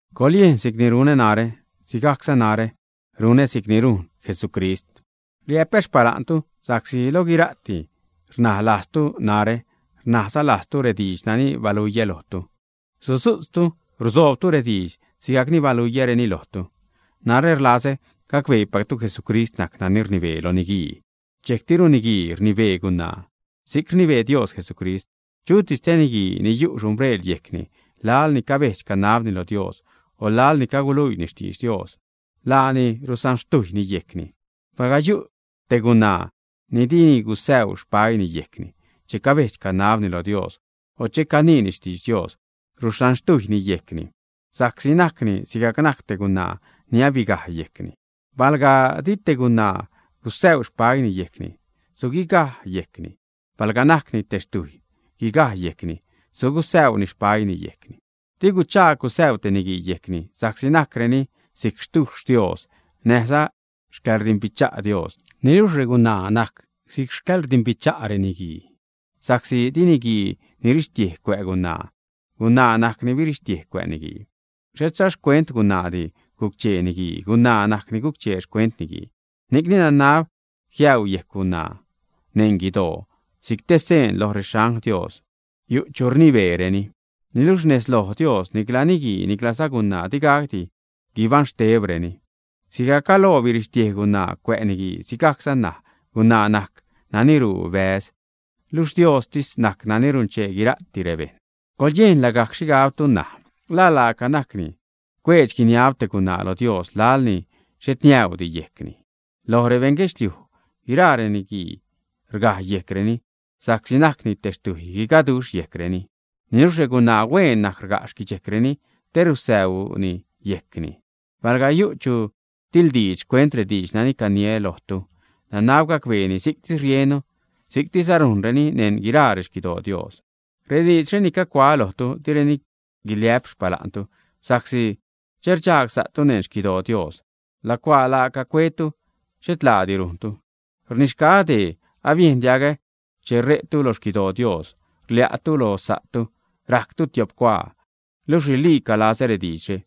Coḻyejn si'cni runä narä, sigajcza narä runä si'cni rujn Jesucrist. Rliä'pä xpala'ntu sa'csi lo guira'ti rnaj lajztu narä, rnajza lajztu rediidx nani baluiä lojtu, sudzu'tztu rusoobtu rediidx sigajcni baluiäreni lojtu. Narä rlazä gacbeepactu Jesucrist najc nani rnibee lo niguii, dxejctiru niguii rnibee gunaa si'c rnibee Dios Jesucrist. Chutis te niguii ni yu' xhumbreel yejcni laḻni cabedx-canabni lo Dios o laḻni caguluiini xtidx Dios, laani rusanxtujyni yejcni. Palga yu' te gunaa ni dini gusäu xpäiini yejcni che cabedx-canabni loj Dios o che caniini xtidx Dios, rusanxtujyni yejcni sa'csi najcni sigajc najc te gunaa ni abigaj yejcni. Palga di te gunaa gusäu xpäiini yejcni suguigaj yejcni. Palga najcni te xtujy guigaj yejcni, sugusäuni xpäiini yejcni. Di guchaag gusäu te niguii yejcni sa'csi najcreni si'c xtuxh Dios, näjza xcäḻrdimbicha' Dios. Niluxh regunaa najc si'c xcäḻrdimbicha' niguii. Sa'csi di niguii nirixtiej cuä' gunaa; gunaa najc ni birixtiej cuä' niguii. Xhetza xcuent gunaadi guc-chee niguii; gunaa najc ni guc-chee xcuent niguii. Ni'cni nanab jiäu yejc gunaa neṉ guidoo si'c te seen lo rexangl Dios yu' chu rnibeereni. Niluxh nez lo Dios nicla niguii niclaza gunaa digacdi guibaṉ xtebreni. Sigajc galoo birixtiej gunaa cuä' niguii, sigajcza ṉaj gunaa najc nani ruu bäz; luxh Diostis najc nani runchee guira'ti rebejṉ. Coḻyejn lagajc xhigabtu ṉaj, ¿la laaca najcni cuedx-guiniab te gunaa lo Dios laḻ ni xhet niäudi yejcni, ä? Loj rebeṉ guedxliuj guiraa reniguii rgaj yejcreni, sa'csi najcni te xtjuy guigaduxh xquidxejcreni. Niluxh regunaa hueen najc rga' xquidxejcreni te rusäuni yejcni. Palga yu' chu tiḻdiidx xcuent rediidx nani caniä lojtu, nanab gacbeeni si'ctis riennu, si'ctisza rujnreni neṉ guiraa rexquidoo Dios. Rediidxre ni cagucuaä lojtu, direni guiliä'p xpala'ntu, sa'csi che rdxagsa'tu neṉ xquidoo Dios, lacuaa laaca cuetu, xhet laadi rujntu. Rnixgaä dee: Abiejn diagä che re'tu lo xquidoo Dios, rlia'tu lo sa'tu rajctu tiop cuaa; luxh riliica lazä rediidxre.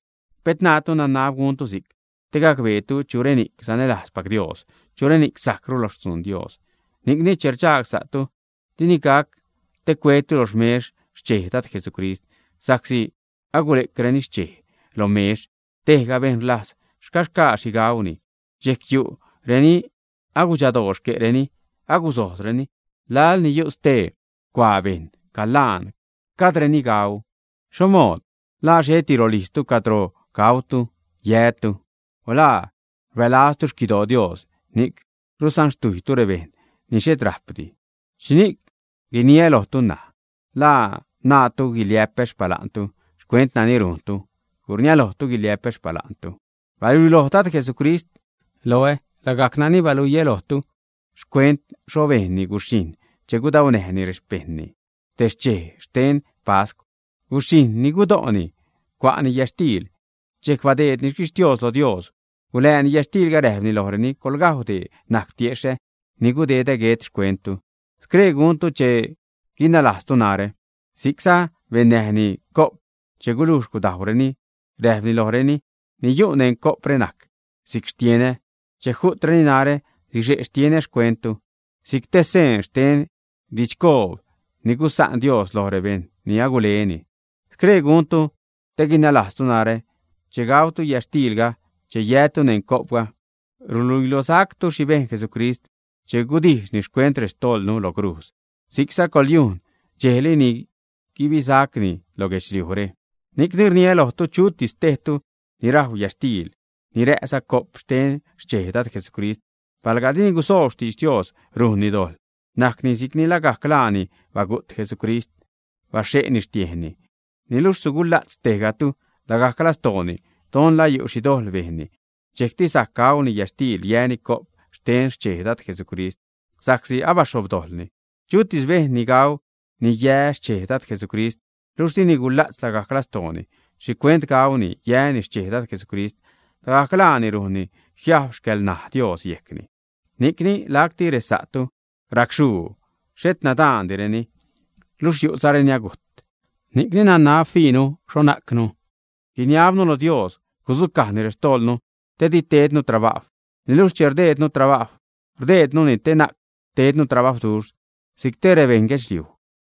Pet naatu nanab guntu si'c te gacbeetu chureni'c sanälajzpac Dios, chureni'c sajcru lo xtzuun Dios. Ni'cni che rdxagsa'tu, dini gac te cuetu lo xmex xchej Dad Jesucrist, sa'csi che agule'creni xchej lo mex, tejga bejṉ rlajz xcaxgaa xhi gauni, dxejc yu' reni agudxadoo xque'reni, agusojzzareni, laḻni yu' stee cuaa bejṉ calaan, gajdreni gau. ¿Xho mood? ¿La xheti rolijztu cadro gac gautu, yätu, ä? O ¿la rbälazlu xquidoo Dios, ni'c rusanxtujylu rebejṉ ni xhet räjpdi, ä? ¿Xhini'c guiniä lojtu ṉaj? ¿La naatu guiliä'pä xpala'ntu xcuent nani rujntu, ä? ¡Gurniälojtu guiliä'pä xpala'ntu! Baluiloj Dad Jesucrist loä lagajc nani baluiä lojtu xcuent xho bejnni guxhijṉ che gudaunäjni rexpejṉni te xchej xten pascw, guxhijṉ ni gudo'ni. Cua'ni yätxtiil, dxejc che abadeedni xquixtios lo Dios, gula'ni yätxtiilga, räjpni lojreni: “Coḻgajw, dee najc tiexhä ni gudedä guet xcuenttu. Scree guntu te guinalajztu narä.” Si'cza bennäjni co'p che gulujx gudajwreni, räjpni lojreni: “Ni yu' neṉ co'pre najc si'c xtienä; che ju'treni narä, sixe' xtienä xcuenttu, si'c te seen xten didxcoob ni gusa'n Dios loj rebejṉ ni aguleni. Scree guntu te guinalajztu narä.” Che gautu yätxtiilga, che yätu neṉ co'pga, ruluilosactu xhi bejn Jesucrist che gudijxni xcuent rextojḻnu lo crujz; si'cza coḻyujn dxejli ni guibisacni lo guedxliujre. Ni'cni rniä lojtu, chutis tejtu ni rajw yätxtiil, ni rä'za co'p xten xchej Dad Jesucrist, palga dini gusoob xtidx Dios, rujnni dojḻ, najcni si'cni lagajc laani bagu't Jesucrist, baxhe'zani xtiejnni. Niluxh sugula'tz tejgatu lagajc lastooni don la yu' xhi dojḻ bejnni, dxejcti sajc gauni yätxtiil, yäni co'p xten xchej Dad Jesucrist, sa'csi abaxhobdojḻni. Chutis bejṉ ni gau, ni yä xchej Dad Jesucrist, luxh dini gula'tz lagajc lastooni xhicuent gauni, yäni xchej Dad Jesucrist, lagajc laani rujnni jiajb xcälnaj Dios yejcni. Ni'cni lacti resa'tu racxhuu, xhet nadaanreni, luxh yu'zareni agujt. Ni'cni nanab fiinu xho najcnu, guiniabnu lo Dios gudzucajni rextojḻnu te didi tednu trabajw. Niluxh che rdejdnu trabajw, rdejdnuni te na'c tednu trabajwduxh si'c ted rebeṉ guedxliuj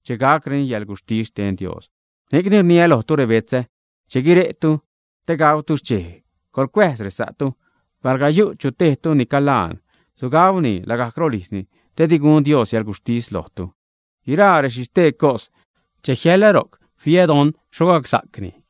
che gacreni yäḻguxhtis xten Dios. Ni'cni rniä lojtu, rebetzä, che guire'tu te gautu xchej, coḻcuäjz resa'tu. Palga yu' chu tejtu ni calaan, sugauni lagajc rolijzni, te di gun Dios yäḻguxhtis lojtu. Guiraa rexhistee cos, che jiäḻä ro'c fiä don xho gacsa'cni.